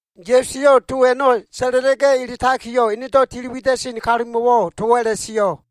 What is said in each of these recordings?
Ya꞉su eyo꞉ to a꞉no꞉ sa꞉la꞉la꞉ga꞉ eletakiyo꞉, enedo꞉ tili wida꞉sen kalumo꞉wo꞉ towo꞉ a꞉la꞉sio꞉,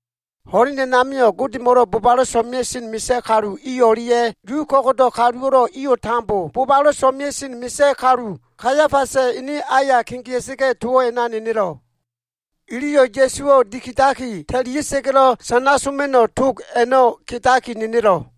Ho꞉len a꞉namio꞉ Godemo꞉lo꞉ bobalo꞉ so꞉mea꞉sen misa꞉ kalu i o꞉lia꞉ Yu ko꞉go꞉do꞉ kaluwo꞉lo꞉ iyo꞉ tambo bobalo꞉ so꞉mea꞉sen misa꞉ kalu, Kaiafasa꞉ ene aya kegea꞉sa꞉ga꞉, towo꞉ a꞉na nenelo꞉. Iliyo꞉ Ya꞉suwo꞉ dikidaki ta꞉lia꞉sa꞉ga꞉lo꞉ sana soma꞉no꞉ tog a꞉no꞉ kedaki nenelo꞉.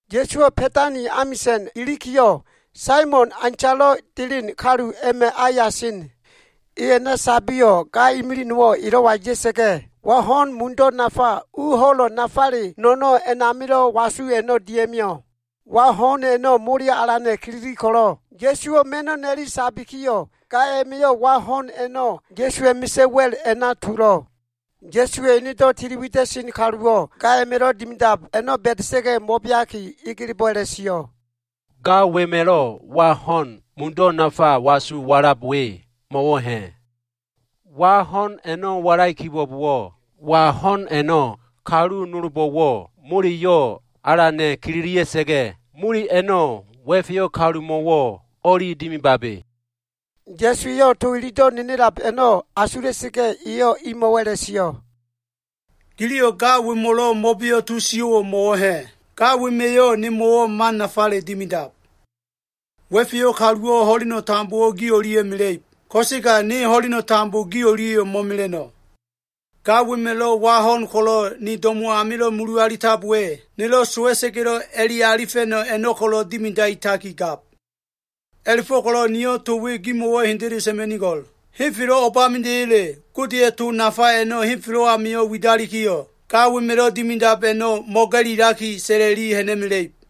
Ya꞉suwo꞉ Ba꞉tani amisa꞉na ilikiyo꞉, Saimon, aintalo꞉ ta꞉len kalu a꞉ma꞉ aya sen. E a꞉na sabiyo꞉, ga imilig nowo꞉ elo꞉wa ya꞉sa꞉ga꞉, wa ho꞉n mudo꞉ nafa, u ho꞉lo꞉ nafale no꞉no꞉ a꞉namilo꞉ wasu a꞉no꞉ dia꞉mio꞉. Wa ho꞉n a꞉no꞉ moleyo꞉ alana꞉ kilili ko꞉lo꞉, Ya꞉suwo꞉ ma꞉no꞉ na꞉li sabikiyo꞉, ga a꞉ma꞉yo꞉ wa ho꞉n a꞉no꞉, Ya꞉suwa꞉ misa꞉ wa꞉l a꞉na tulo꞉. Ya꞉suwa꞉ tili wida꞉sen kaluwo꞉ ga a꞉ma꞉lo꞉ dimidab a꞉no꞉ ba꞉da꞉sa꞉ga꞉ mo꞉beaki, egelebo꞉ a꞉la꞉sio꞉, “Ga wema꞉lo꞉ wa ho꞉n mudo꞉ nafa wasu walab we mo꞉wo꞉ ha꞉? Wa ho꞉n a꞉no꞉ mo꞉walai kibo꞉bowo꞉, wa ho꞉n a꞉no꞉ kalu nolbo꞉wo꞉ moleyo꞉ alana꞉ kililia꞉sa꞉ga꞉, mole a꞉no꞉ wa꞉feyo꞉ kalumo꞉wo꞉ o꞉li dimibabe.” Ya꞉su eyo꞉ to ilido꞉ nenelab a꞉no꞉ asula꞉sa꞉ga꞉, eyo꞉ imo꞉wo꞉ a꞉la꞉sio꞉, “Giliyo꞉ ga wemo꞉lo꞉ mo꞉beo꞉ to sio꞉wo꞉ mo꞉wo꞉ ha꞉? Ga wema꞉yo꞉ nemo꞉wo꞉ man nafale dimidab. Wa꞉feyo꞉ kaluwo꞉ ho꞉leno꞉ tambo gi o꞉lia꞉ mela꞉ib, ko꞉sega ne ho꞉leno꞉ tambo gi o꞉lia꞉yo꞉ mo꞉mela꞉no꞉. Ga wema꞉lo꞉ wa ho꞉n ko꞉lo꞉ ni do꞉mo꞉ amilo꞉ mulu alitab we, nelo꞉ sowa꞉sa꞉ga꞉lo꞉ a꞉le alifa꞉no꞉ a꞉no꞉ ko꞉lo꞉ dimidaitaki gab. A꞉la꞉fo꞉ko꞉lo꞉ niyo꞉ to we gimo꞉wo꞉ hendele sa꞉ma꞉nigo꞉l. Henfelo꞉ o꞉bamida꞉ya꞉le Godeya꞉ to nafa a꞉no꞉ henfelo꞉ amio꞉ widalikiyo꞉, ga wema꞉lo꞉ dimidab a꞉no꞉ mo꞉ga꞉lilaki, sa꞉la꞉li ha꞉na꞉mela꞉ib.”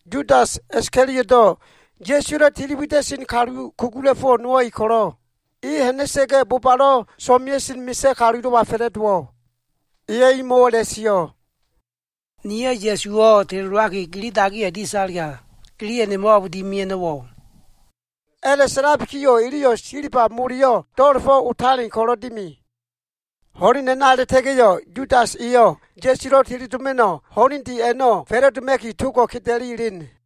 Yudas Iskalioto꞉, Ya꞉suwa꞉lo꞉ tili wida꞉sen kalu kugula꞉fo꞉ nowo꞉ e ko꞉lo꞉, e ha꞉na꞉sa꞉ga꞉ bobalo꞉ so꞉mea꞉sen misa꞉ kalulo꞉wa fa꞉la꞉dowo꞉. Eyo꞉ imo꞉wo꞉ a꞉la꞉sio꞉, “Niyo꞉ Ya꞉suwo꞉ teledowaki, gili dagiya dia꞉talega, giliyo꞉ nemo꞉wo꞉ o꞉b dimia꞉no꞉wo꞉?” A꞉la꞉sa꞉labikiyo꞉ iliyo꞉ silba moleyo꞉ do꞉la꞉fo꞉ otalen a꞉la꞉fo꞉ko꞉lo꞉ dimi. Ho꞉len a꞉na a꞉la꞉ta꞉ga꞉yo꞉, Yudas eyo꞉ Ya꞉sulo꞉ teledoma꞉no꞉ ho꞉lende a꞉no꞉ fa꞉la꞉doma꞉ki togo꞉ keda꞉li elen.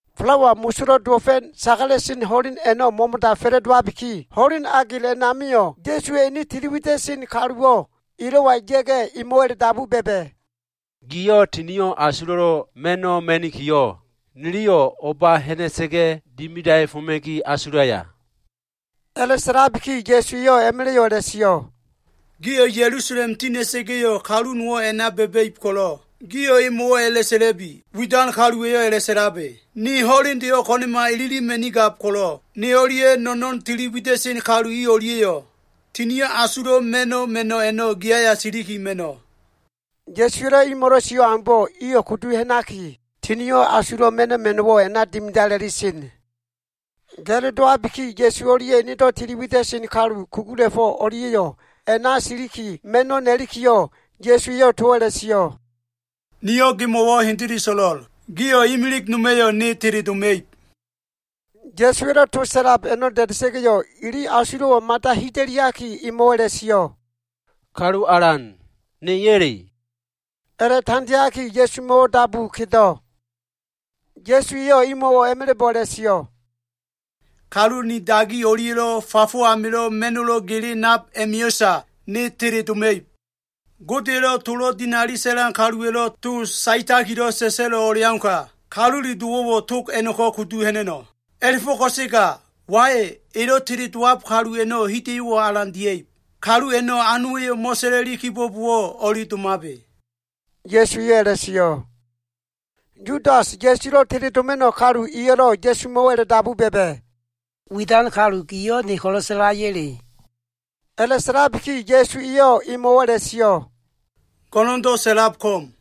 Falawa Mosolo꞉ Dowo꞉fa꞉ sagala꞉sen ho꞉len a꞉no꞉ mo꞉mo꞉da fa꞉la꞉dowabiki, ho꞉len agel a꞉namio꞉ Ya꞉suwa꞉ ene tili wida꞉sen kaluwo꞉ elo꞉wa ya꞉ga꞉, emo꞉wo꞉ a꞉la꞉dabu ba꞉ba꞉, “Giyo꞉ Tinio꞉ Asulo꞉lo꞉ Ma꞉no꞉ ma꞉nikiyo꞉, niliyo꞉ o꞉ba ha꞉na꞉sa꞉ga꞉ dimidaefoma꞉ki asulaya?” A꞉la꞉sa꞉labiki Ya꞉su eyo꞉ a꞉ma꞉la꞉yo꞉ a꞉la꞉sio꞉, “Gio꞉ Ya꞉lusalem tina꞉sa꞉ga꞉yo꞉, kalu nowo꞉ a꞉na ba꞉ba꞉ib ko꞉lo꞉, gio꞉ emo꞉wo꞉ a꞉la꞉sa꞉la꞉bi, ‘Widan kaluwa꞉yo꞉ a꞉la꞉sa꞉labe, “Ni ho꞉lendeyo꞉ ko꞉na꞉ma ililima꞉nigab ko꞉lo꞉, ne o꞉lia꞉ no꞉no꞉n tili wida꞉sen kalu i o꞉lia꞉yo꞉ Tinio꞉ Asulo꞉ Ma꞉no꞉ a꞉no꞉ gi aya siliki ma꞉no꞉.”’” Ya꞉suwa꞉lo꞉ imo꞉lo꞉ sio꞉ aumbo꞉ iyo꞉ kudu ha꞉naki, Tinio꞉ Asulo꞉ Ma꞉no꞉ ma꞉no꞉wo꞉ a꞉na dimidala꞉li sen. Ga꞉lo dowabiki, Ya꞉su o꞉lia꞉ enedo꞉ tili wida꞉sen kalu kugula꞉fo꞉ o꞉lia꞉yo꞉ a꞉na siliki ma꞉no꞉ na꞉likiyo꞉, Ya꞉su eyo꞉ towo꞉ a꞉la꞉sio꞉, “Niyo꞉ gimo꞉wo꞉ hendele so꞉lo꞉l. Gio꞉ imilig noma꞉yo꞉ ne teledoma꞉ib.” Ya꞉suwa꞉lo꞉ to sa꞉lab a꞉no꞉ da꞉da꞉sa꞉ga꞉, ili asulo꞉wo꞉ mada hida꞉liaki emo꞉wo꞉ a꞉la꞉sio꞉, “Kalu Alan, neya꞉le?” A꞉la꞉tandeaki Ya꞉sumo꞉ dabu kedo꞉. Ya꞉su eyo꞉ imo꞉wo꞉ a꞉ma꞉la꞉bo꞉ a꞉la꞉sio꞉, “Kalu ni dagi o꞉lia꞉lo꞉ fafo amilo꞉ ma꞉no꞉lo꞉ gele nab a꞉ma꞉yo꞉sa ne teledoma꞉ib. Godeya꞉lo꞉ tolo꞉ dinali sa꞉lan kaluwa꞉lo꞉ to saetakilo꞉ sa꞉sa꞉lo꞉ o꞉leauka, Kalule Dowo꞉wo꞉ tog a꞉no꞉ko꞉ kudu ha꞉na꞉no꞉. A꞉la꞉fo꞉ ko꞉sega wai, elo꞉ teledowab kalu a꞉no꞉ hida꞉yo꞉wo꞉ alan dia꞉ib. Kalu a꞉no꞉ anowa꞉yo꞉ mo꞉sa꞉la꞉li kibo꞉bowo꞉ o꞉li domabe.” Ya꞉su eyo꞉ a꞉la꞉sio꞉. Yudas, Ya꞉sulo꞉ teledoma꞉no꞉ kalu eyo꞉lo꞉ Ya꞉sumo꞉wo꞉ a꞉la꞉dabu ba꞉ba꞉, “Widan kalu giyo꞉ ne ko꞉lo꞉ sa꞉laya꞉le?” A꞉la꞉sa꞉labiki Ya꞉su eyo꞉ emo꞉wo꞉ a꞉la꞉sio꞉, “Go꞉no꞉ndo꞉ sa꞉lab ko꞉m.”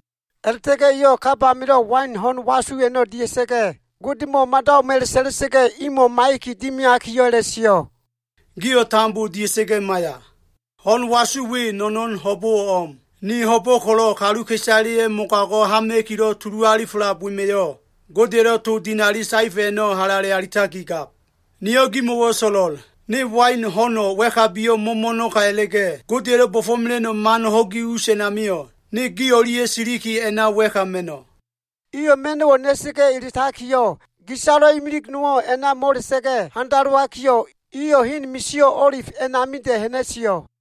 A꞉la꞉ta꞉ga꞉ eyo꞉ kab amilo꞉ wain ho꞉n wasu a꞉no꞉ dia꞉sa꞉ga꞉, Godemo꞉ mada o꞉m a꞉la꞉sa꞉la꞉sa꞉ga꞉, imo꞉ maiya꞉ki dimiakiyo꞉ a꞉la꞉sio꞉, “Gio꞉ tambo dia꞉sa꞉ga꞉ maiya. Ho꞉n wasu we, no꞉no꞉n ho꞉bo꞉wo꞉ o꞉m. Ni ho꞉bo꞉ ko꞉lo꞉ kaluka꞉isaleya꞉ mogago꞉ hama꞉kilo꞉ tulu alifelab wema꞉yo꞉, Godeya꞉lo꞉ to dinali saefa꞉ a꞉no꞉ halale alitakigab. Niyo꞉ gimo꞉wo꞉ so꞉lo꞉l. Ne wain ho꞉no꞉ wa꞉kabiyo꞉ mo꞉mo꞉no꞉ka a꞉la꞉ga꞉, Godeya꞉lo꞉ bo꞉fo꞉mela꞉no꞉ man ho꞉gi us a꞉namio꞉, ne gi o꞉lia꞉ siliki a꞉na wa꞉ka ma꞉no꞉.” Iyo꞉ ma꞉no꞉wo꞉ na꞉sa꞉ga꞉ eletakiyo꞉, gisalo꞉ imilig nowo꞉ a꞉na mo꞉la꞉sa꞉ga꞉ handalowakiyo꞉, iyo꞉ hen misio꞉ O꞉lif a꞉namida꞉ ha꞉na꞉sio꞉.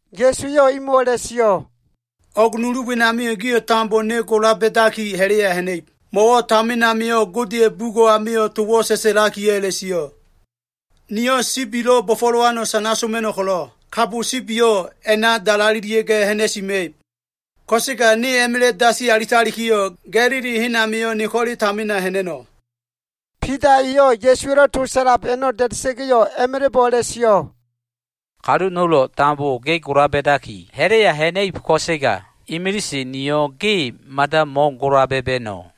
Ya꞉su eyo꞉ imo꞉wo꞉ a꞉la꞉sio꞉, “O꞉g nulu wenamio꞉ gio꞉ tambo ne gola ba꞉daki ha꞉la꞉ya ha꞉na꞉ib. Mo꞉wo꞉ tamin amio꞉ Godeya꞉ bugo꞉ amio꞉ towo꞉ sa꞉sa꞉lakiyo꞉ a꞉la꞉sio꞉, “ ‘Niyo꞉ sibilo꞉ bo꞉fo꞉lowano꞉ sana soma꞉no꞉ ko꞉lo꞉, kabo sibiyo꞉ a꞉na dalalelia꞉ga꞉ ha꞉na꞉sima꞉ib.’ Ko꞉sega ne a꞉ma꞉la꞉ dasi alitalikiyo꞉, Ga꞉lili hen amio꞉ ne ko꞉le tamina ha꞉na꞉no꞉.” Bida eyo꞉ Ya꞉suwa꞉lo꞉ to sa꞉lab a꞉no꞉ da꞉da꞉sa꞉ga꞉yo꞉, a꞉ma꞉la꞉bo꞉ a꞉la꞉sio꞉, “Kalu nolo꞉ tambo ge gola ba꞉daki, ha꞉la꞉ya ha꞉na꞉ib, ko꞉sega imilise niyo꞉ ge mada mo꞉gola ba꞉ba꞉no꞉.”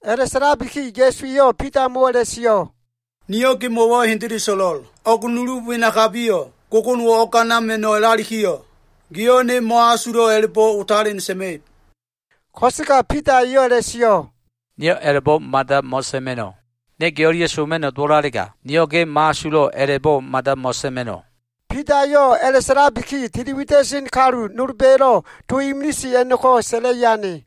A꞉la꞉sa꞉labiki Ya꞉su eyo꞉ Bidamo꞉wo꞉ a꞉la꞉sio꞉, “Niyo꞉ gemo꞉wo꞉ hendele so꞉lo꞉l. O꞉g nulu wenakabiyo꞉, gogonowo꞉ o꞉ganama꞉no꞉ o꞉lalikiyo꞉, giyo꞉ ne mo꞉asulo꞉ a꞉la꞉bo꞉ otalen sa꞉ma꞉ib.” Ko꞉sega Bida eyo꞉ a꞉la꞉sio꞉, “Niyo꞉ a꞉la꞉bo꞉ mada mo꞉sa꞉ma꞉no꞉. Ne ge o꞉lia꞉ soma꞉no꞉ dowo꞉lalega, niyo꞉ ge mo꞉asulo꞉ a꞉la꞉bo꞉ mada mo꞉sa꞉ma꞉no꞉.” Bida eyo꞉ a꞉la꞉sa꞉labiki, tili wida꞉sen kalu nolba꞉yo꞉lo꞉ to imilise a꞉no꞉ko꞉ sa꞉la꞉i ane.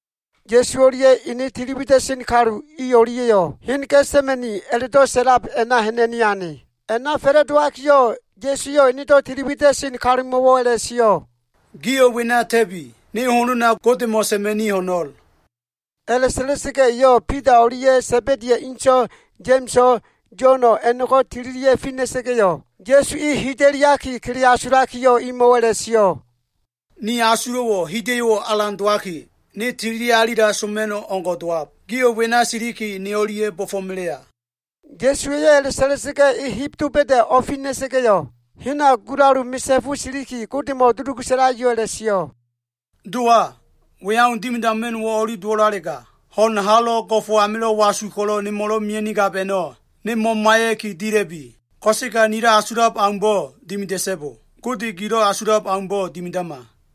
Ya꞉su o꞉lia꞉ ene tili wida꞉sen kalu i o꞉lia꞉yo꞉ hen Ga꞉sa꞉ma꞉ni a꞉la꞉do꞉ sa꞉lab a꞉na ha꞉na꞉ni ane. A꞉na fa꞉la꞉dowakiyo꞉, Ya꞉su eyo꞉ enedo꞉ tili wida꞉sen kalumo꞉wo꞉ a꞉la꞉sio꞉, “Gio꞉ wena ta꞉bi. Ne honona Godemo꞉ sa꞉ma꞉ni ho꞉no꞉l.” A꞉la꞉sa꞉la꞉sa꞉ga꞉ eyo꞉ Bida o꞉lia꞉ Sa꞉ba꞉di inso꞉ Ya꞉ma꞉so꞉, Yo꞉no꞉ a꞉no꞉ko꞉ tililia꞉ fina꞉sa꞉ga꞉yo꞉, Ya꞉su e hida꞉liaki kele asulakiyo꞉ imo꞉wo꞉ a꞉la꞉sio꞉, “Ni asulo꞉wo꞉ hida꞉yo꞉ alan dowaki, ne tilialila soma꞉no꞉ o꞉ngo꞉ dowab. Gio꞉ wena siliki ne o꞉lia꞉ bo꞉fo꞉melea.” Ya꞉su eyo꞉ a꞉la꞉sa꞉la꞉sa꞉ga꞉, e heb doba꞉da꞉ o꞉fina꞉sa꞉ga꞉yo꞉, hena gulalu misa꞉fu siliki, Godemo꞉ dulugu sa꞉lakiyo꞉ a꞉la꞉sio꞉. “Dowa, we au dimidama꞉no꞉wo꞉ o꞉li dowo꞉lalega, ho꞉n halo꞉ go꞉fo꞉ amilo꞉ wasu ko꞉lo꞉ nemo꞉lo꞉ mea꞉nigab a꞉no꞉, ne mo꞉maiya꞉ki dila꞉bi. Ko꞉sega nilo꞉ asulab aumbo꞉ dimida꞉so꞉bo. Gode gilo꞉ asulab aumbo꞉ dimidama.”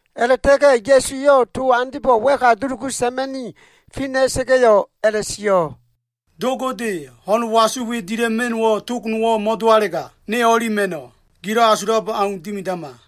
A꞉la꞉ta꞉ga꞉ Ya꞉su eyo꞉ to andebo꞉ wa꞉ka dulugu sa꞉ma꞉ni fina꞉ga꞉yo꞉ a꞉la꞉sio꞉, “Do Gode, ho꞉n wasu we dila꞉ma꞉no꞉wo꞉ tog nowo꞉ mo꞉dowalega, ne o꞉li ma꞉no꞉. Gilo꞉ asulab au dimidama.”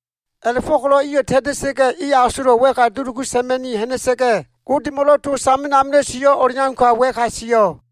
A꞉la꞉fo꞉ko꞉lo꞉ iyo꞉ ta꞉ta꞉sa꞉ga꞉yo꞉, e asolo꞉ wa꞉ka dulugu sa꞉ma꞉ni ha꞉na꞉sa꞉ga꞉, Godemo꞉lo꞉ to tamin amilo꞉ sio꞉ o꞉leauka wa꞉ka sio꞉.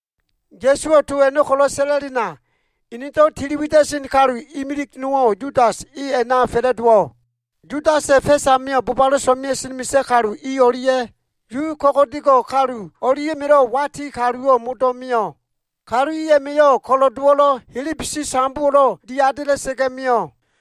Ya꞉suwo꞉ to a꞉no꞉ ko꞉lo꞉ sa꞉la꞉lena, enedo꞉ tiliwida꞉sen kalu imilig nowo꞉ Yudas e a꞉na fa꞉la꞉dowo꞉. Yudasa꞉ fa꞉s amio꞉, bobalo꞉ so꞉mea꞉sen misa꞉ kalu i o꞉lia꞉ Yu ko꞉go꞉dego꞉ kalu o꞉lia꞉ma꞉lo꞉ wati kaluwo꞉ modo꞉ mio꞉. Kalu i a꞉ma꞉yo꞉ ko꞉lo꞉dowo꞉lo꞉, helebesi sambowo꞉lo꞉ diadela꞉sa꞉ga꞉ mio꞉.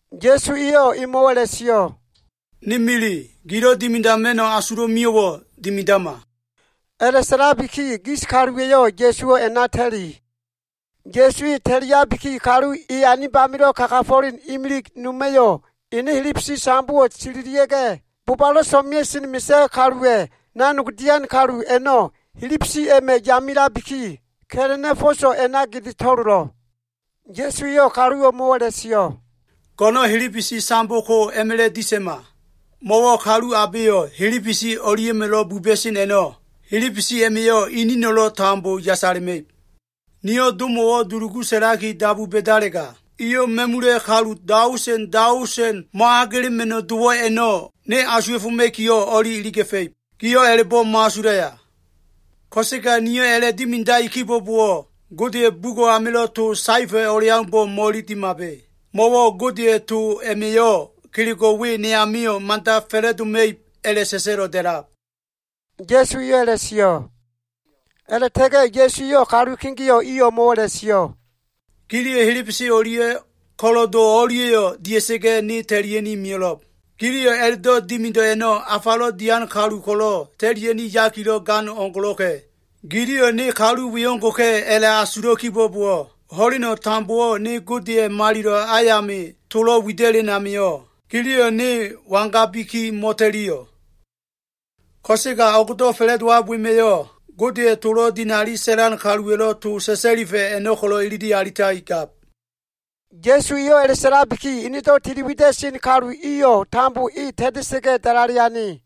Ya꞉su eyo꞉ emo꞉wo꞉ a꞉la꞉sio꞉, “Ni mili, gilo꞉ dimidama꞉no꞉ asulo꞉ mio꞉wo꞉ dimidama.” A꞉la꞉sa꞉labiki gis kaluwa꞉yo꞉ Ya꞉suwo꞉ a꞉na ta꞉li. Ya꞉su e ta꞉liabiki, kalu e anib amilo꞉ kagafo꞉len imilig noma꞉yo꞉, ene helebesi sambowo꞉ sililia꞉ga꞉, bobalo꞉ so꞉mea꞉sen misa꞉ kaluwa꞉ nanog dian kalu a꞉no꞉ helebesi a꞉ma꞉ yamelabiki, ka꞉la꞉na꞉ fo꞉so꞉ a꞉na gede to꞉lolo꞉. Ya꞉su eyo꞉ kalu o꞉mo꞉wo꞉ a꞉la꞉sio꞉, “Go꞉no꞉n helebesi sambo ko a꞉ma꞉la꞉ disa꞉ma. Mo꞉wo꞉ kalu abeyo꞉ helebesi o꞉lia꞉ma꞉lo꞉ buba꞉sen a꞉no꞉, helebesi a꞉ma꞉yo꞉ inino꞉lo꞉ tambo yasala꞉ma꞉ib. Niyo꞉ Domo꞉wo꞉ dulugu sa꞉laki dabu ba꞉dalega, eyo꞉ ma꞉mula꞉ kalu daosen daosen mo꞉agela꞉ma꞉no꞉ dowo꞉ a꞉no꞉ ne asuwa꞉foma꞉kiyo꞉ o꞉li iliga꞉fa꞉ib. Giyo꞉ a꞉la꞉bo꞉ mo꞉asulaya? Ko꞉sega niyo꞉ a꞉la꞉dimidai kibo꞉bowo꞉, Godeya꞉ bugo꞉ amilo꞉ to saefa꞉ o꞉leaumbo꞉ mo꞉ililimabe. Mo꞉wo꞉ Godeya꞉ to a꞉ma꞉yo꞉ kelego꞉ we ne amio꞉ mada fa꞉la꞉doma꞉ib a꞉la꞉sa꞉sa꞉lo꞉ da꞉lab,” Ya꞉su eyo꞉ a꞉la꞉sio꞉. A꞉la꞉ta꞉ga꞉ Ya꞉su eyo꞉ kalu kegeo꞉ i o꞉mo꞉wo꞉ a꞉la꞉sio꞉, “Giliyo꞉ helebesi o꞉lia꞉ ko꞉lo꞉do o꞉lia꞉yo꞉ dia꞉sa꞉ga꞉, ne ta꞉lia꞉ni mio꞉lo꞉b. Gililo꞉ a꞉la꞉dimido꞉ a꞉no꞉, afalo꞉ dian kalu ko꞉lo꞉ ta꞉lia꞉no꞉ yakilo꞉ gan o꞉leo꞉ngo꞉lo꞉ka꞉. Giliyo꞉ ne kalu we o꞉ngo꞉ka꞉ a꞉la꞉asulo꞉ kibo꞉bowo꞉, ho꞉leno꞉ tambowo꞉ ne Godeya꞉ malilo꞉ ayami tolo꞉ wida꞉len amio꞉, giliyo꞉ ne wangabiki mo꞉ta꞉liyo꞉? Ko꞉sega o꞉gdo꞉ fa꞉la꞉dowab wema꞉yo꞉, Godeya꞉ tolo꞉ dinali sa꞉lan kaluwa꞉lo꞉ to sa꞉sa꞉lifa꞉ a꞉no꞉ ko꞉lo꞉ ilili alitakigab.” Ya꞉su eyo꞉ a꞉la꞉sa꞉labiki, enedo꞉ tili wida꞉sen kalu iyo꞉ tambo e ta꞉ta꞉sa꞉ga꞉ dalale ane.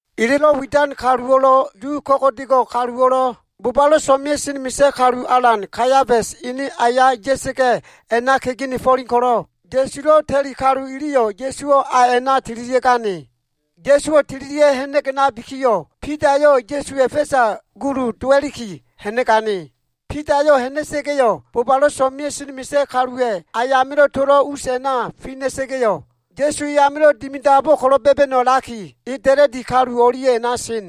Elelo꞉ widan kalu iyo꞉lo꞉ Yu ko꞉go꞉do꞉ kaluwo꞉lo꞉, bobalo꞉ so꞉mea꞉sen misa꞉ kalu alan, Kaiafasa꞉ ene aya ya꞉sa꞉ga꞉ a꞉na kegenefo꞉len ko꞉lo꞉, Ya꞉sulo꞉ ta꞉li kalu iliyo꞉, Ya꞉suwo꞉ a a꞉na tililia꞉gane. Ya꞉suwo꞉ tililia꞉ ha꞉na꞉ga꞉ ha꞉nabikiyo꞉, Bidayo꞉ Ya꞉suwa꞉ fa꞉sa gulu dowa꞉liki ha꞉na꞉gane. Bidayo꞉ ha꞉na꞉sa꞉ga꞉, bobalo꞉ so꞉mea꞉sen misa꞉ kaluwa꞉ ayamilo꞉ tolo꞉ us a꞉na tina꞉sa꞉ga꞉yo꞉, Ya꞉su amilo꞉ dimidabo꞉ ko꞉lo꞉ ba꞉ba꞉no꞉ a꞉laki, e da꞉la꞉di kalu o꞉lia꞉ a꞉na sen.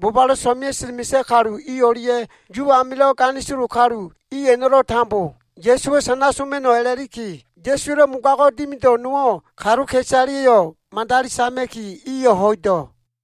Bobalo꞉ so꞉mea꞉sen misa꞉ kalu i o꞉lia꞉ Yu amilo꞉ ganisolo kalu i a꞉no꞉lo꞉ tambo Ya꞉suwo꞉ sana soma꞉no꞉ a꞉la꞉liki, Ya꞉suwa꞉lo꞉ mogago꞉ dimido꞉ nowo꞉ kaluka꞉isaleyo꞉ madali sama꞉ki, iyo꞉ ho꞉ido꞉.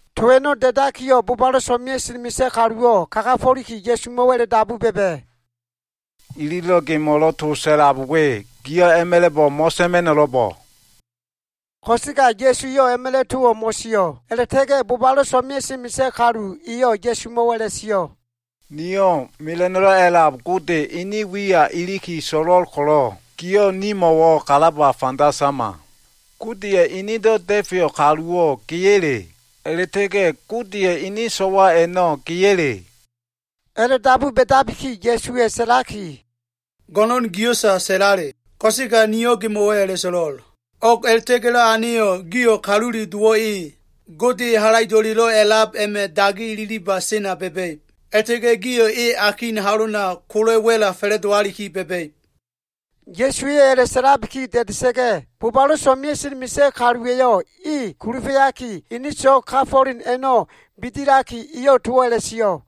To a꞉no꞉ da꞉dakiyo꞉, bobalo꞉ so꞉mea꞉sen misa꞉ kaluwo꞉ kagafo꞉liki, Ya꞉sumo꞉wo꞉ a꞉la꞉dabu ba꞉ba꞉, “Ililo꞉ gemo꞉lo꞉ to sa꞉lab we, giyo꞉ a꞉ma꞉la꞉bo꞉ mo꞉sa꞉ma꞉no꞉lo꞉bo꞉?” Ko꞉sega Ya꞉su eyo꞉ a꞉ma꞉la꞉ towo꞉ mo꞉sio꞉. A꞉la꞉ta꞉ga꞉ bobalo꞉ so꞉mea꞉sen misa꞉ kalu eyo꞉ Ya꞉sumo꞉wo꞉ a꞉la꞉sio꞉, “Niyo꞉ Mela꞉no꞉lo꞉ A꞉lab Gode, ene wiya iliki so꞉lo꞉l ko꞉lo꞉, giyo꞉ nimo꞉wo꞉ kalaba fanda sama. Godeya꞉ enedo꞉ Da꞉feyo꞉ Kaluwo꞉ geya꞉le? A꞉la꞉ta꞉ga꞉ Godeya꞉ ene so꞉wa a꞉no꞉ geya꞉le?” A꞉la꞉dabu ba꞉dabiki, Ya꞉suwa꞉ sa꞉laki, “Go꞉no꞉n gio꞉sa sa꞉lale. Ko꞉sega niyo꞉ gimo꞉wo꞉ a꞉la꞉so꞉lo꞉l. O꞉g a꞉la꞉ta꞉ga꞉lo꞉ aneyo꞉, gio꞉ Kalule Dowo꞉ e, Gode Halaido꞉lelo꞉ A꞉lab a꞉ma꞉ dagi ililiba sena ba꞉ba꞉ib. A꞉la꞉ta꞉ga꞉ gio꞉ e akin halona kola꞉ wa꞉la fa꞉la꞉dowaliki ba꞉ba꞉ib.” Ya꞉suwa꞉yo꞉ a꞉la꞉sa꞉labiki da꞉da꞉sa꞉ga꞉, bobalo꞉ so꞉mea꞉sen misa꞉ kaluwa꞉yo꞉ e kulufa꞉yaki, ene so꞉g kafo꞉len a꞉no꞉ bidilaki, eyo꞉ towo꞉ a꞉la꞉sio꞉,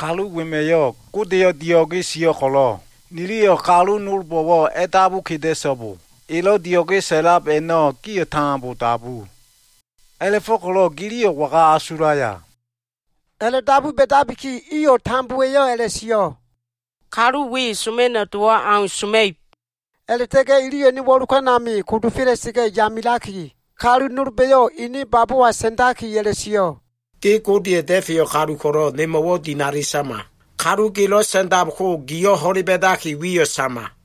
“Kalu wema꞉yo꞉ Godeyo꞉ dio꞉ge sio꞉ ko꞉lo꞉, niliyo꞉ kalu nolbo꞉wo꞉ a꞉dabu keda꞉so꞉bo. Elo꞉ dio꞉ge sa꞉lab to a꞉no꞉ gio꞉ tambo dabu. A꞉la꞉fo꞉ko꞉lo꞉ giliyo꞉ waga asulaya?” A꞉la꞉dabu ba꞉dabiki, iyo꞉ tambowa꞉yo꞉ a꞉la꞉sio꞉, “Kalu we soma꞉no꞉ dowo꞉ au soma꞉ib.” A꞉la꞉ta꞉ga꞉ iliyo꞉ ene wo꞉lokan ami kodofela꞉sa꞉ga꞉ yamelaki, kalu nolba꞉yo꞉ ene babowa sa꞉ndaki a꞉la꞉sio꞉, “Ge Godeya꞉ Da꞉feyo꞉ kalu ko꞉lo꞉, nimo꞉wo꞉ dinali sama. Kalu gelo꞉ sa꞉ndab ko giyo꞉ ho꞉le ba꞉daki wiyo꞉ sama.”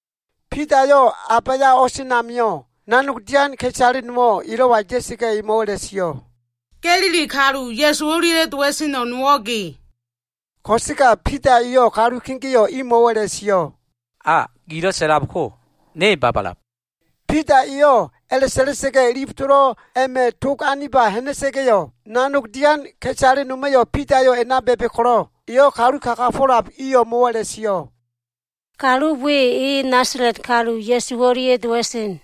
Bidayo꞉ a baya o꞉sen amio꞉, nanog dian ka꞉isale nowo꞉ elo꞉wa ya꞉sa꞉ga꞉, emo꞉wo꞉ a꞉la꞉sio꞉, “Ga꞉lili kalu Ya꞉su o꞉lia꞉lo꞉ dowa꞉seno꞉ nowo꞉ ge.” Ko꞉sega Bida eyo꞉ kalu kegeo꞉ imo꞉wo꞉ a꞉la꞉sio꞉, “Gilo꞉ sa꞉lab ko ne babalab.” Bida eyo꞉ a꞉la꞉sa꞉la꞉sa꞉ga꞉, ilif tolo꞉ a꞉ma꞉ tog aniba ha꞉na꞉sa꞉ga꞉yo꞉, nanog dian ka꞉isale noma꞉yo꞉ Bidayo꞉ a꞉na ba꞉ba꞉ ko꞉lo꞉, eyo꞉ kalu kagafo꞉lab i o꞉mo꞉wo꞉ a꞉la꞉sio꞉, “Kalu we, e Nasala꞉t kalu Ya꞉su o꞉lia꞉ dowa꞉sen.”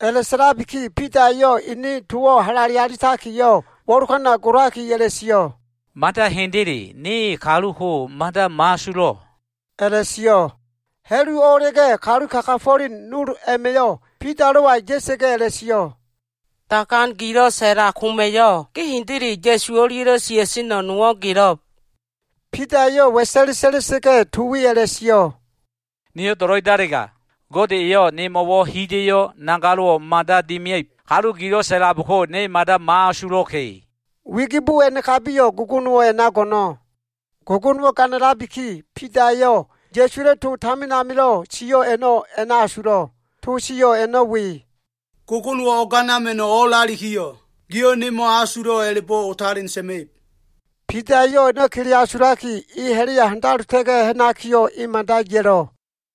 A꞉la꞉sa꞉labiki Bida eyo꞉ ene towo꞉ halale alitakiyo꞉ wo꞉lokana golaki a꞉la꞉sio꞉, “Mada hendele, ne kalu ko mada mo꞉asulo꞉,” a꞉la꞉sio꞉. Ha꞉lu o꞉a꞉la꞉ga꞉, kalu kagafo꞉len nol a꞉ma꞉yo꞉ Bidalo꞉wa ya꞉sa꞉ga꞉ a꞉la꞉sio꞉, “Dagan gilo꞉ sa꞉lab koma꞉yo꞉, ge hendele Ya꞉su o꞉lia꞉lo꞉ sia꞉seno꞉ nowo꞉ gelo꞉b.” Bida eyo꞉ wa꞉sa꞉le sa꞉la꞉sa꞉ga꞉, to we a꞉la꞉sio꞉, “Niyo꞉ do꞉lo꞉idalega, Gode eyo꞉ nemo꞉wo꞉ hida꞉yo꞉ nagalo꞉ mada dimia꞉ib. Kalu gilo꞉ sa꞉labko, ne mada mo꞉asulo꞉ka꞉!” Wigibo a꞉nakabiyo꞉, gogonowo꞉ a꞉na go꞉no꞉. Gogonowo꞉ ganalabiki, Bidayo꞉ Ya꞉suwa꞉lo꞉ to tamin amilo꞉ sio꞉ a꞉no꞉ a꞉na asulo꞉. To sio꞉ a꞉no꞉ we, “Gogonowo꞉ o꞉ganama꞉no꞉ o꞉lalikiyo꞉, giyo꞉ ne mo꞉asulo꞉ a꞉la꞉bo꞉ otalen sa꞉ma꞉ib.” Bida eyo꞉ a꞉no꞉ kele asulaki, e ha꞉la꞉ya handalota꞉ga꞉ ha꞉nakiyo꞉, mada ya꞉lo꞉.